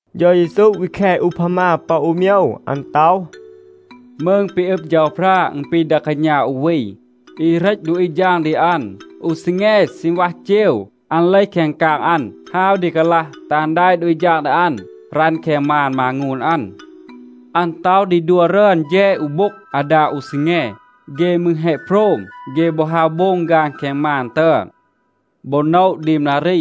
เฌา เยซู วี แค อูพามา ปอ อู โมยว. อัน ต็อห, “มืง ปี อึบ เฌาพรา อึณ ปี ดา กาณา อู วี, อี เหรต ดูอี ฌาง ดี อัน. อู ซีแง ซีณวัห เจว, อัน เลห แคง กาง อัน ฮาว ดี กาลัห, แตห อัน แดะ ดูอี ฌาง ดี อัน, รัณ แคง มาน มางูน อัน. อัน ต็อห ดี ดัว รึอน แฌด อู โบ็ง อาดา อู ซีแง. เฆ มืร แฮะ โพรม, เฆ บอ ฮาว โบง ฆาน แคง มาน ตึอน. บอ โนะ ดีม นารี,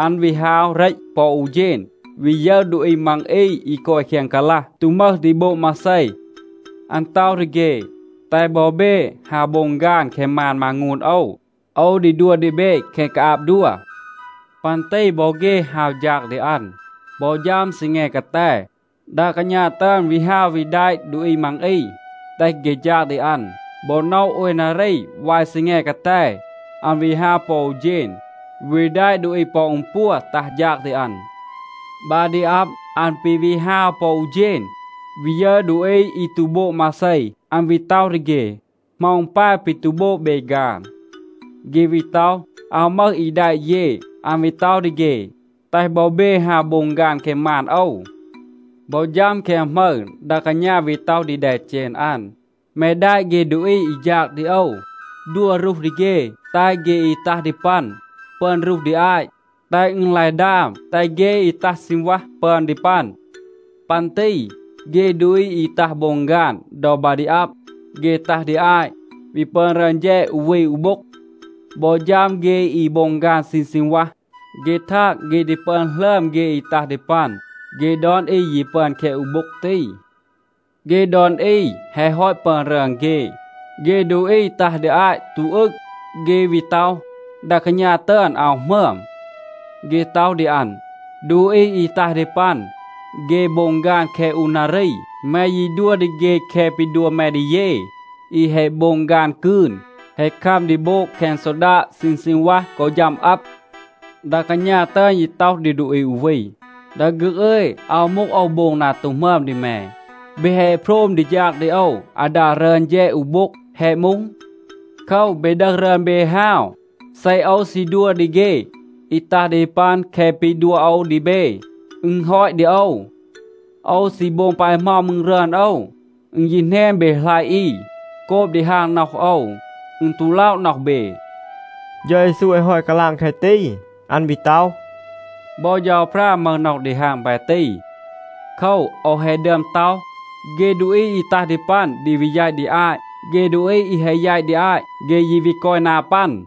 อัน วี ฮาว เหรต ปอ อู เฌณ, วี ยึร ดูอี มัง อี อี กอย แคง กาลัห, ตู มึห ดี โบง มาเซ. อัน ต็อห ดี เฆ, ‘แตห บอ เบ ฮาว โบง ฆาน แคง มาน มางูน โอว. โอว ดี ดัว ดี เบ แคะ กาอาบ ดัว.’ ปัน ตี บอ เฆ ฮาว ฌาง ดี อัน. บอ ฌัม ซีแง กาแต, ดา กาณา ตึอน วี ฮาว วี แดะ ดูอี มัง อี, แตห เฆ ฌาง ดี อัน. บอ โนะ โอย นารี วาย ซีแง กาแต, อัน วี ฮาว ปอ อู เฌณ, วี แดะ ดูอี ปอ อึณ ปัว ตัห ฌาง ดี อัน. บา ดี อับ, อัน ปี วี ฮาว ปอ อู เฌณ, วี ยึร ดูอี อี ตู โบง มาเซ. อัน วี ต็อห ดี เฆ, ‘เหมา อึณ ปาย ปี ตู โบง เบ ฆาน?’ เฆ วี ต็อห, ‘อาว มึห อี แดะ เย.’ อัน วี ต็อห ดี เฆ, ‘แตห บอ เบ ฮาว โบง ฆาน แคง มาน โอว.’ บอ ฌัม แคง หมึร, ดา กาณา วี ต็อห ดี แดเจณ อัน, ‘แม แดะ เฆ ดูอี อี ฌาง ดี โอว, ดัว รูห ดี เฆ. แตห เฆ อี ตัห ดี ปัน ปึอน รูห ดี อาต, แตห อึณ ลาย ดาม, แตห เฆ อี ตัห ซีณวัห ปึอน ดี ปัน.’ ปัน ตี เฆ ดูอี อี ตัห โบง ฆาน ดอ บา ดี อับ, เฆ ตัห ดี อาต, วี ปึอน รึอน แฌด อู วี อู โบ็ง. บอ ฌัม เฆ อี โบง ฆาน ซีณ ซีณวัห, เฆ ทาง, เฆ ดี ปึอน หลึอม เฆ อี ตัห ดี ปัน. เฆ ดอน อี ยี ปึอน แคะ อู โบ็ง ตี. เฆ ดอน อี แฮะ ฮอต ปึอน รึอน เฆ, เฆ ดูอี ตัห ดี อาต ตู อึง, เฆ วี ต็อห, ดา กาณา ตึอน อาว หมึอม. เฆ ต็อห ดี อัน, ‘ดูอี อี ตัห ดี ปัน, เฆ โบง ฆาน แคะ อู นารี. แม ยี ดัว ดี เฆ แคะ ปี ดัว แม ดี เย อี แฮะ โบง ฆาน กืน, แฮะ คัม ดี โบง แคง ซอดาด ซีณ ซีณวัห กอ ฌัม อับ.’ ดา กาณา ตึอน ยี ต็อห ดี ดูอี อู วี, ‘ดา ฆึก อึย, อาว มูห, โอว โบง นา ตู หมึอม ดี แม. เบ แฮะ โพรม ดี ฌาง ดี โอว อาดา รึอน แฌด อู โบ็ง. แฮะ มูห? โคว, เบ ดึห รึอน เบ, ฮาว. เซ โอว ซี ดัว ดี เฆ อี ตัห ดี ปัน แคะ ปี ดัว โอว ดี เบ, อึณ ฮอต ดี โอว. โอว ซี โบง ปาย เหมา มืร รึอน โอว. อึณ ยี แหนน เบ หลัยะ อี. โกบ ดีฮาง น็อห โอว, อึณ ตู ล็อะ น็อห เบ.’” เฌา เยซู แฮะ ฮอต กาลาง แคะ ตี, อัน วี ต็อห, “บอ เฌาพรา มึห น็อห ดีฮาง ปาย ตี. โคว, โอว แฮะ ดึอม ต็อห, เฆ ดูอี อี ตัห ดี ปัน ดี วี แยต ดี อาต. เฆ ดูอี อี แฮะ แยต ดี อาต, เฆ ยี วี กอย นา ปัน.”a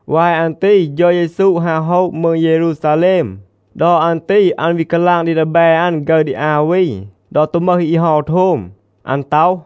วาย อัน ตี เฌา เยซู ฮาว โฮะ มืง เยรูซาแลม. ดอ อัน ตี อัน วี กาลาง ดี ดีแบ อัน ฆึร ดี อา วี ดอ ตู มึห อี เฮา โทม. อัน ต็อห,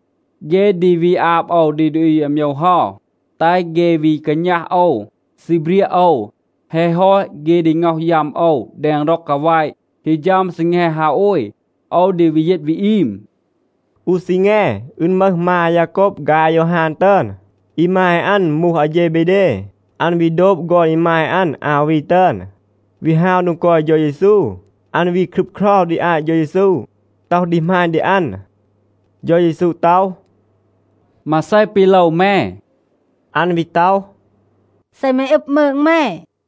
เฆ ดี วี อาบ โอว ดี ดูอี อาโมยว เฮา, แตห เฆ วี กาณัห โอว, ซีเบรียะ โอว. แฮะ ฮอต, เฆ ดี ง็อห ยัม โอว แดง ร็อง กาแวะ. ฮี ฌัม ซีแง ฮาโอย, โอว ดี วี ยีต วี อีม.” อู ซีแง, อึณ มึห มา อายาโกบ ฆาย อายอฮาน ตึอน. อีมาย อัน มูห อาเฌเบเด. อัน วี โดบ ฆอน อีมาย อัน อา วี ตึอน, วี ฮาว โดง กอย เฌา เยซู. อัน วี ครึบเครา ดี อาต เฌา เยซู, ต็อห ดี หมาณ ดี อัน. เฌา เยซู ต็อห, “มาเซ ปี โลว แม?” อัน วี ต็อห, “เซ แม อึบ มืง แม,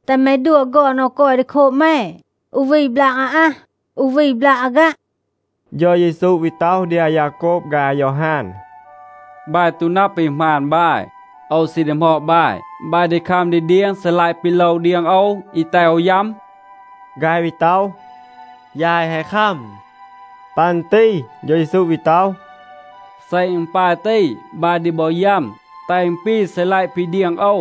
แตห แม ดัว ฆอน โอว กอย ดี โคบ แม, อู วี บลาก อาอัห, อู วี บลาก อาฆัะ.” เฌา เยซู วี ต็อห ดี อายาโกบ ฆาย อายอฮาน, “บาย ตู นับ ปี หมาณ บาย. โอว ซี ดีหมอด บาย. บาย ดี คัม ดี เดียง ซีลัยะ ปี โลว เดียง โอว, อี แตห โอว ยัม?”b ฆาย วี ต็อห, “ยาย แฮะ คัม.” ปัน ตี เฌา เยซู วี ต็อห, “เซ อึณ ปาย ตี, บาย ดี บอ ยัม, แตห อึณ ปี ซีลัยะ ปี เดียง โอว.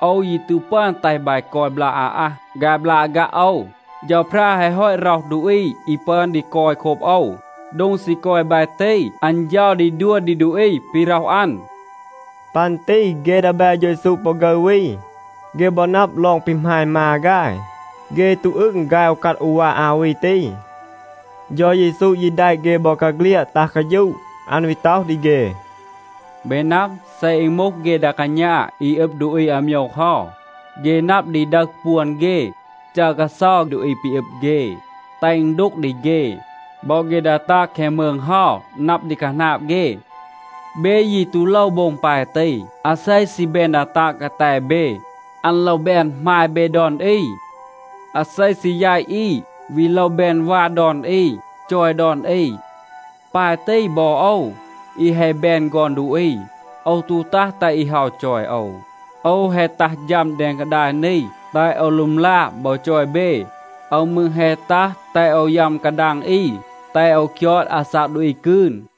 โอว ยี ตู ปึอน แตห บาย กอย บลาก อาอัห ฆาย บลาก อาฆัะ โอว. เฌาพรา แฮะ ฮอต ร็อห ดูอี อี ปึอน ดี กอย โคบ โอว. โดง ซี กอย บาย ตี, อัน เฌา ดี ดัว ดี ดูอี ปี ร็อห อัน.” ปัน ตี เฆ ดีแบ เฌา เยซู ปอ ฆึร วี, เฆ บอ นับ ลอง ปี หมาณ มา ฆาย, เฆ ตู อึง ฆาย อูกัด อูวา อา วี ตี. เฌา เยซู ยี แดะ เฆ บอกาเฆลียด ตัห กาฌูะ. อัน วี ต็อห ดี เฆ, “เบ นับ, เซ อึณ มูห เฆ ดา กาณา อี อึบ ดูอี อาโมยว เฮา, เฆ นับ ดี ดึห ปวน เฆ, จัร กาเซา ดูอี ปี อึบ เฆ, แตห อึณ ดูก ดี เฆ. บอ เฆ ดา ตาง แคง มืง เฮา นับ ดี คาหนาบ เฆ. เบ ยี ตู โลว โบง ปาย ตี. อาเซ ซี แบน ดา ตาง กาแต เบ, อัน โลว แบน หมาย เบ ดอน อี. อาเซ ซี แยต อี, วี โลว แบน วา ดอน อี, จอย ดอน อี. ปาย ตี บอ โอว, อี แฮะ แบน ฆอน ดูอี, โอว ตู ตัห แตห อี เฮา จอย โอว. โอว แฮะ ตัห ฌัม แดง กาดาย นี, แตห โอว ลึมลา บอ จอย เบ. โอว มืร แฮะ ตัห, แตห โอว ยัม กาดาง อี, แตห โอว คยอด อาซาก ดูอี กืน.”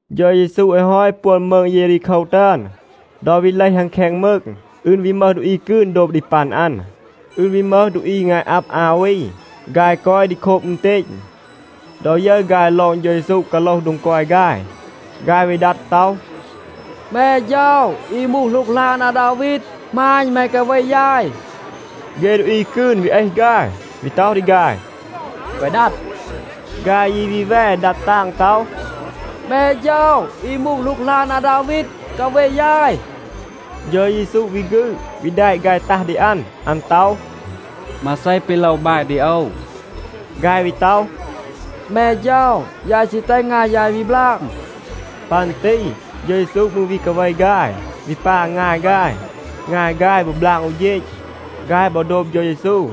เฌา เยซู แฮะ ฮอต ปวน มืง เยรีโคว ตึอน. ดอ วี เลห อัน แคง มืง, อึณ วี มึห ดูอี กืน โดบ ดี ปัน อัน. อึณ วี มึห ดูอี งาย อับ อา วี. ฆาย กอย ดี โคบ อึณเตณ. ดอ ยึร ฆาย ลอง เฌา เยซู กาโลห โดง กอย ฆาย, ฆาย วี ดัด ต็อห, “แม เฌา, อี มูห หลูกหลาน อาดาวีด, หมาณ แม กาเว ยาย.” เฆ ดูอี กืน วี เอห ฆาย, วี ต็อห ดี ฆาย, “แกวะ ดัด.” ฆาย ยี วี แว ดัด ตาง ต็อห, “แม เฌา, อี มูห หลูกหลาน อาดาวีด, กาเว ยาย.” เฌา เยซู วี ฆืด, วี แดะ ฆาย ตัห ดี อัน. อัน ต็อห, “มาเซ ปี โลว บาย ดี โอว?” ฆาย วี ต็อห, “แม เฌา, ยาย ซี แตห งาย ยาย วี บลาง.” ปัน ตี เฌา เยซู มืร วี กาเว ฆาย, วี ปา งาย ฆาย. งาย ฆาย บอ บลาง อู เฌณ. ฆาย บอ โดบ เฌา เยซู.